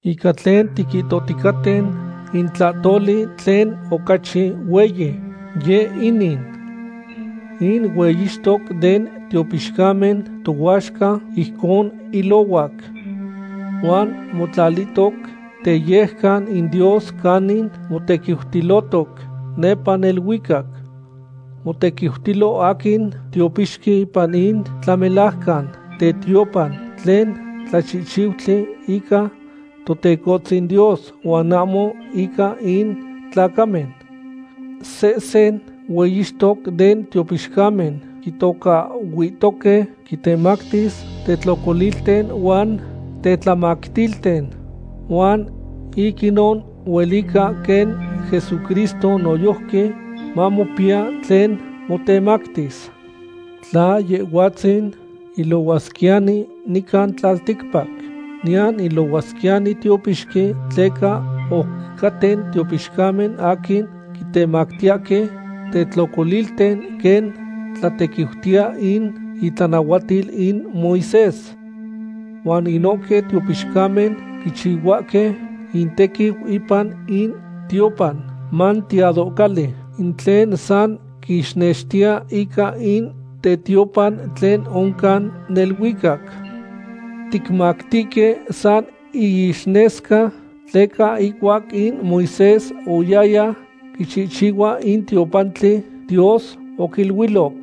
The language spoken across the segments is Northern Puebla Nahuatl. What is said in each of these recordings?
Ica tlen tiquihtoticaten, in tlahtoli tlen ocachi hueyi, yeh inin. In hueyixtoc den tiopixcamen tohuaxca ijcon ilohuac. Huan motlalilotoc teyejcan in Dios canin motequiutilotoc nepa neluicac. Motequiutilo aquin tiopixqui ipan in tlamelajcan tetiopan, tlen tlachihchiutli ica Totecohtzin Dios huan ahmo ica in tlacamen. Sehsen hueyixtoc den tiopixcamen quitocahhuihtoque quitemactis tetlocolilten huan tetlamactilten, huan ic inon huelica quen Jesucristo noyojqui mamopiya tlen motemactis. Tla Yehhuatzin ilohuasquiyani nican tlalticpac, niyan ilohuasquiyani tiopixqui, tleca oc caten tiopixcamen aquin quitemactiyahque tetlocolilten quen tlatequiutiya in itlanahuatil in Moisés. Huan inohque tiopixcamen quichihuahque intequiu ipan in tiopan manteadohcali, in tlen san quixnextiya ica in tetiopan tlen oncan neluicac. Ticmatihque san iixnesca, tleca ihcuac in Moisés oyaya quichihchihua in tiopantli, Dios oquiluiloc: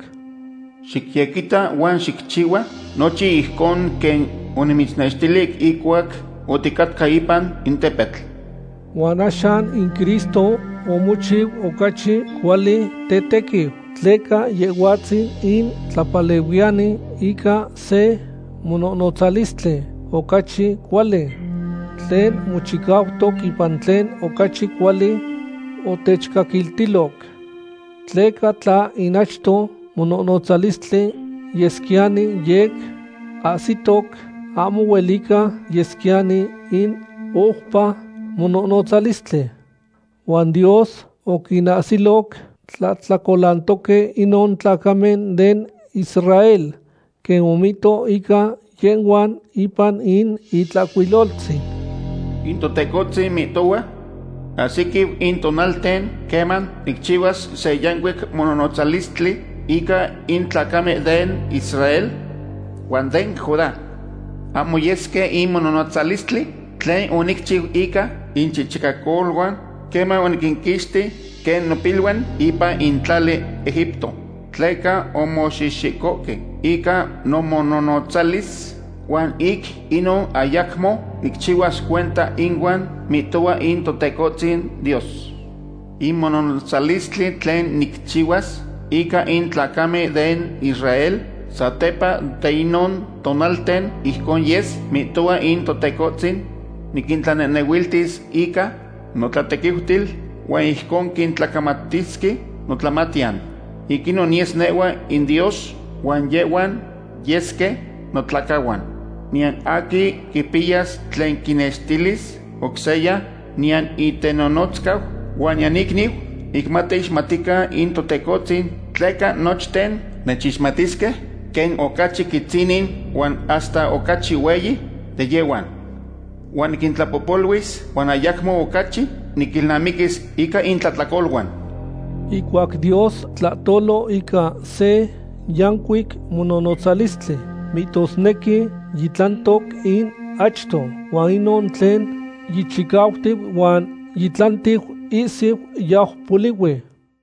“Xicyequitac huan xicchihua nochin ijcon quen onimitznextili ihcuac oticatca ipan in tepetl.” Huan axan in Cristo omochiu ocachi cuali tetequiu, tleca Yehhuatzin in tlapalehuiyani ica se mononotzalistli ocachi cuali, tlen mochicautoc ipan tlen ocachi cuali otechcaquiltiloc. Tleca tla in achto mononotzalistli yesquiyani yec ahsitoc, ahmo huelica yesquiyani in oupa mononotzalistli. Huan Dios oquinahsiloc tlahtlacolantoque inon tlacamen den Israel, quen omihto ica yehhuan ipan in Itlahcuiloltzin: In Totecohtzin mihtohua: Ahsiquiu in tonalten queman nicchihuas se yancuic mononotzalistli ica in tlacamen den Israel huan den Judá. Ahmo yes quen in mononotzalistli tlen onicchiu ica inchichicacoluan queman oniquinquixti quen nopiluan ipan in tlali Egipto. Tleca omoxihxicohque ica nomononotzalis huan ic inon ayacmo nicchihuas cuenta inuan, mihtohua in Totecohtzin Dios. In mononotzalistli tlen nicchihuas ica in tlacamen den Israel satepa de inon tonalten ijcon yes, mihtohua in Totecohtzin: Niquintlanehnehuiltis ica notlatequiutil, huan ijcon quitlacamatisque notlamatiyan. Ic inon niyes nehhua inDios Huan yehhuan yesque notlacahuan. Niyan aquin quipiyas tlen quinextilis oc seya, niyan in itenonotzcau huan niyan iicniu, ic mateixmatican in Totecohtzin, tleca nochten nechixmatisque, quen ocachi quitzinin huan hasta ocachi hueyi de yehhuan. Huan niquintlapohpoluis huan ayacmo ocachi niquilnamiquis ica intlahtlacoluan. Ihcuac Dios tlahtolo ica se yancuic mononotzalistli, mihtosnequi yitlantoc in achto, huan inon tlen yichicautiu huan yitlantiu ihsiu yau polihui.